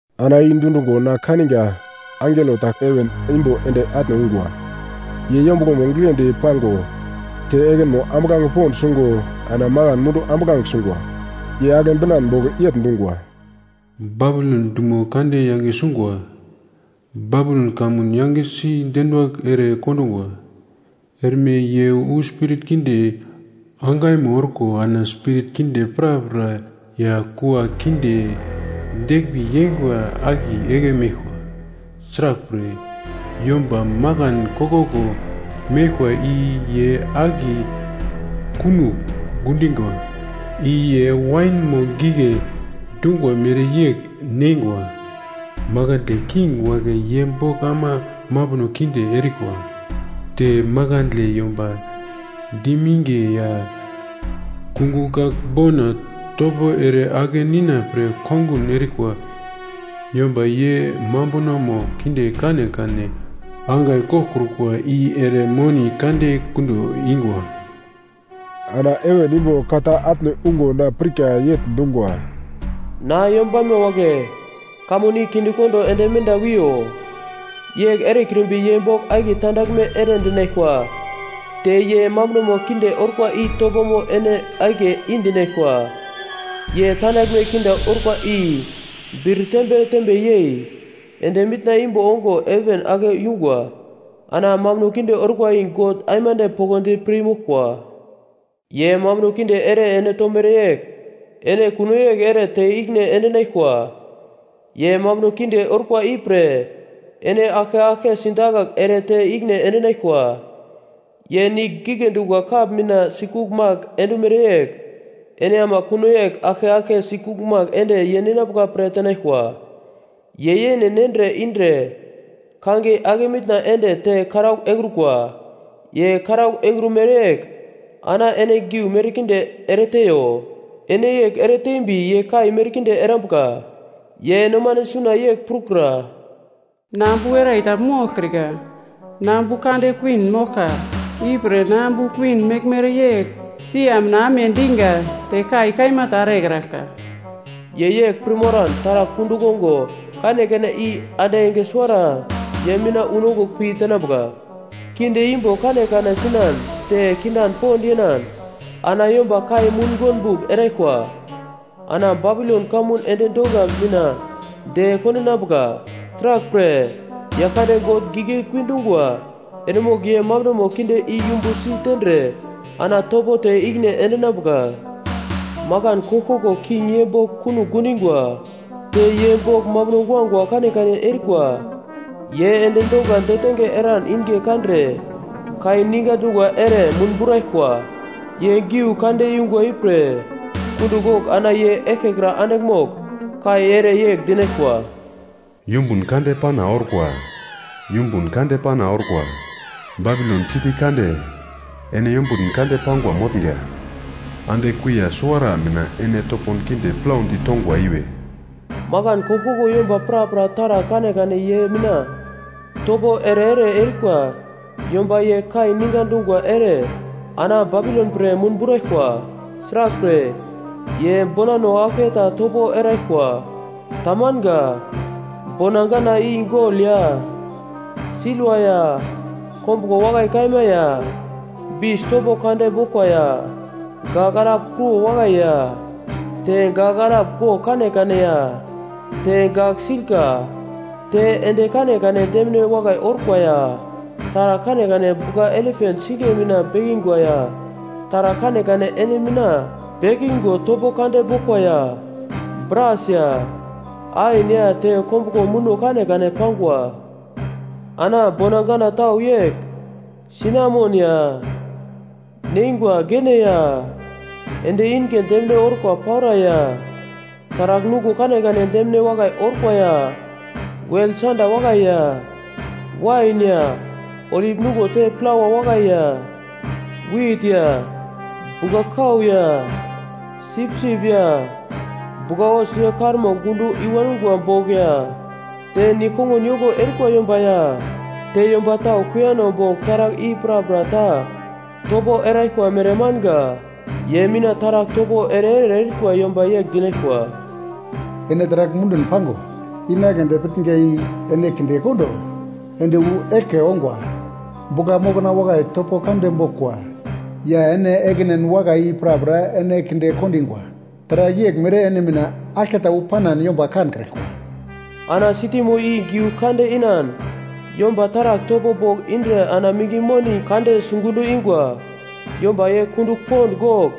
Ana i dundungo na kaninga angelo ta heven imbo ende atne ungwa. Ye yombuglomo giglendi pango te ekinmo ambuglange pond sungo ana makan mundu ambuglange sungwa. Ye agle binan bogl yegl dungwa: “Babilon dumo kande yange sungwa! Babilon kamun yangesi deruwagl ere kondungwa! Erme ye wu spirit kinde angaimo orkwa ana spirit kinde prapra ya kua kinde deglmbi yeingwa akiye igle meglkwa. Sraglpre, yomba makan koglkoglo meglkwa i ye akiye kunogl gundingwa. I ye wainmo gigle dungwa mereyegl neingwa, makandle king wagle ye bogl ama mambuno kinde erikwa. Te makandle yomba diminge ya kungugl gagl bona topo ere ake nina pre kongun erikwa yomba ye mambunomo kinde kanekane angai goglkrukwa i ere moni kande gundo ingwa.” Ana heven imbo ka ta atne ungo na pirka yegl dungwa: “Na yombanma wagle, kamun i kindekondo ende menda wiyo. Yegl erekrimbi ye bogl akiye tandaglme ere dinaglkwa te ye mambunomo kinde orkwa i topomo ene akiye i-dinaglkwa. Ye tandaglme kinde orkwa i bir tembe tembe yei ende mitna imbo ongo heven ake yungwa, ana mambuno kinde orkwa i God aimande poglodi pir moglkwa. Ye mambuno kinde ere ene tomere yegl ene kuno yegl ere te ikine endinaglkwa, ye mambuno kinde orkwa i pre ene aglke aglke sidakagl ere te ikine endinaglkwa. Ye nigl gigle dungwa kap mina sikugl magle endumere yegl ene ama kuno yegl aglke aglke sikugl magle ende ye ninambuka pre tenaglkwa. Ye yene nendre indre kangiye ake mitna ende te karaugl engrukwa, ye karaugl engrumere yegl ana ene giu merkinde ereteiyo. Ene yegl ereteimbi ye kai merkinde erambuka. Ye nomane suna yegl prukura, ‘Na ambu werai ta moglkrika, na ambu kande kuwin moglka. Ipre na ambu kuwin mereyegl sia mina amediga te kai kaima ta erekraglka.’ Ye yegl pir moran taragl kundugl ongo kanekane i ande enge suwarata ye mina unongugl pi tenambuka. Kinde imbo kanekane sinan te kindan pond yenan ana yomba kai mungonbugl eraglkwa. Ana Babilon kamun endi donga mina de kondinambuka. Sraglpre, Yaglkande God giglekui dungwa eremogl ye mambunono kinde i yumbusi tendre ana topo te ikine endinambuka. “Makan koglkoglo king ye bogl kunogl gundingwa te ye bogl mambuno guagua kanekane erikwa ye endi donga detenge eran inge kandre kai ninga dungwa ere munburaglkwa. Ye giu kande yungwa ipre kundugl gogl ana ye eglkekra andigl mogl kai ere yegl dinaglkwa: “‘Yumbun kande pana orkwa! Yumbun kande pana orkwa! Babilon siti kande ene yombutn kande pangwa motnga. Ande kuiya suwara mina ene topon kinde plaudi tongwa iwe!’ “Makan koglkoglo yomba prapra taragl kanekane ye mina topo ere-ere erikwa yomba ye kai ninga dungwa ere ana Babilon pre munburaglkwa. Sraglpre, ye bonano aglketa topo eraglkwa. Tamanga. Bona gana i gol ya silva ya kombuglo wakai kaima ya bis topo kande boglkwa ya gagl alap kruwo wakai ya te gagl alap gogl kanekane ya te gagl-silka. Te endi kanekane demine wakai orkwa ya taragl kanekane bugla-elepant singiye mina bekingwa ya taragl kanekane endi mina bekigo topo kande boglkwa ya bras ya ain ya te kombuglo muno kanekane pangwa. Ana bona gana tau yegl. Sinamon ya neingwa gene ya endi inge demine orkwa paura ya taragl nuglo kanekane demine wakai orkwa ya wel sanda wakai ya wain ya olip nuglo te plawa wakai ya wit ya bugla-kau ya sipsip ya bugla-hos ye karmo gundo i wangwa bogl ya te nigl-kongun yoko erikwa yomba ya te yomba tau kuiyano bogl taragl i prapra ta topo eraglkwa mere manga. “Ye mina taragl topo ere-ere erikwa yomba yegl dinaglkwa, ‘Ene taragl mundun pango inagledi pitnga i ene kindekondo ende wu eglke ongwa. Bugla mokna wakai topo kande boglkwa ya ene ekinen wakai i prapra ene kinde kondingwa. Taragl yeglmere ene mina aglketa wu panan yomba kankraglkwa.’ Ana sitimo i giugl kande inan yomba taragl topo bogl indre ana minge moni kande sigundo ingwa, yomba ye kundugl pond gogl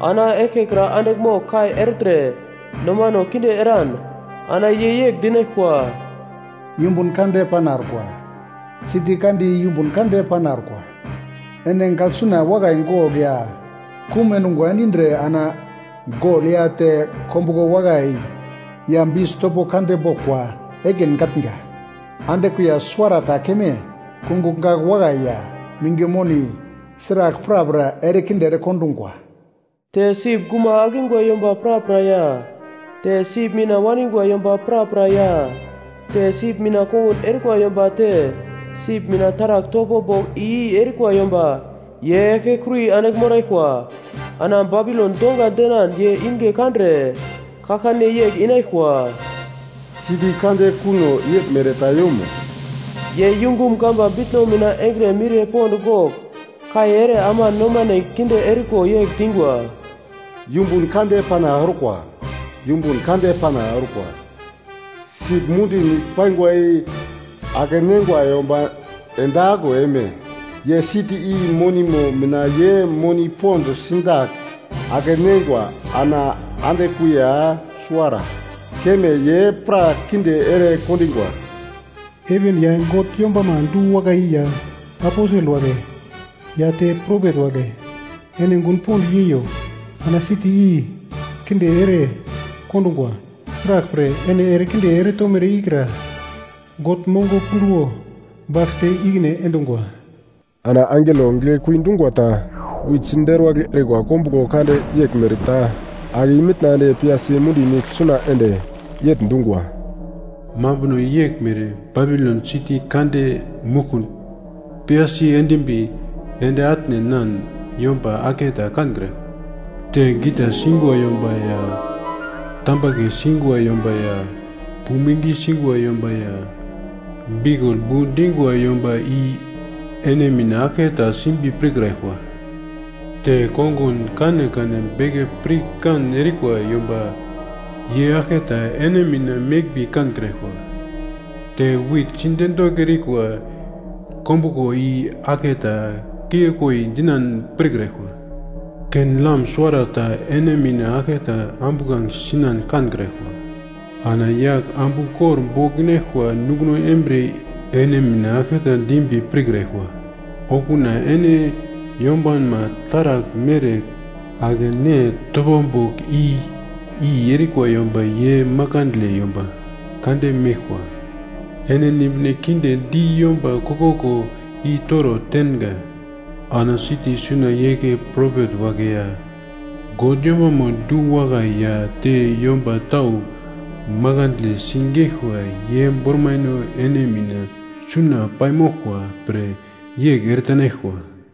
ana eglkekra andigl mogl kai ertre nomano kinde eran: ana ye yegl dinaglkwa: “‘Yumbun kande pana orkwa! Siti kande i yumbun kande pana orkwa! Ene gaglsuna wakai gogl ya kum endungwa endindre ana gol ya te kombuglo wakai ya bis topo kande boglkwa ekin gatnga! Ande kuiya suwarata keme kungugl gagl wakai ya minge moni sragl prapra erekinde erekondungwa!’ “Te sip guma akingwa yomba prapra ya te sip mina waningwa yomba prapra ya te sip mina kongun erikwa yomba te sip mina taragl topo bogl i-i erikwa yomba, ye eglkekuri andigl moraglkwa. Ana Babilon donga denan ye inge kandre, kaglkane yegl inaglkwa, ‘Siti kande kuno yeglmere ta yomo?’ Ye yungum gamba bitno mina engre miriye pond gogl kai ere ama nomane kinde eriko yegl dingwa: “‘Yumbun kande pana orkwa! Yumbun kande pana orkwa! Sip mundi nigle paingwa i ake-neingwa yomba ende aglo eime? Ye siti i monimo mina ye moni pond sidagl ake-neingwa ana ande kuiya suwara keme ye pra kinde ere kondingwa! Heven ya God yombama du-wakai ya aposel wagle ya te propet wagle ene gun pond yeiyo, ana siti i kinde ere kondungwa! Sraglpre, ene erekinde eretomere ikra God mongo punduwo bagl te ikine endungwa.’” Ana angelo giglekui dungwa ta wit siderwagl erikwa kombuglo kande yeglmere ta ake i-mitna ende piyasi mundi nigl suna ende, yegl dungwa: “Mambuno yeglmere Babilon siti kande muglkumdi piyasi endimbi ende atne enan yomba aglketa kankraglkwa. Te gita singwa yomba ya tambagle singwa yomba ya puming singwa yomba ya biukul bu dingwa yomba i ene mina aglketa simbi pirkraglkwa. Te kongun kanekane beke pirkan erikwa yomba ye aglketa ene mina meglmbi kankraglkwa. Te wit siderwagl erikwa kombuglo i aglketa kiglekoi dinan pirkraglkwa. Ken-lam suwarata ene mina aglketa ambuglange sinan kankraglkwa. Ana yagl ambu kor bogl inaglkwa nunguno embriye ene mina aglketa dimbi pirkraglkwa. Okuna ene yombanma taragl mere ake ne topo bogl i-i erikwa yomba ye makandle yomba kande meglkwa. Ene nimbine kinde di yomba koglkoglo i-toro tenga. Ana siti suna igle propet wagle ya God yombama duwakai ya te yomba tau makandle sigeglkwa ye bormaino ene mina suna paimoglkwa pre yegl eretenaglkwa.”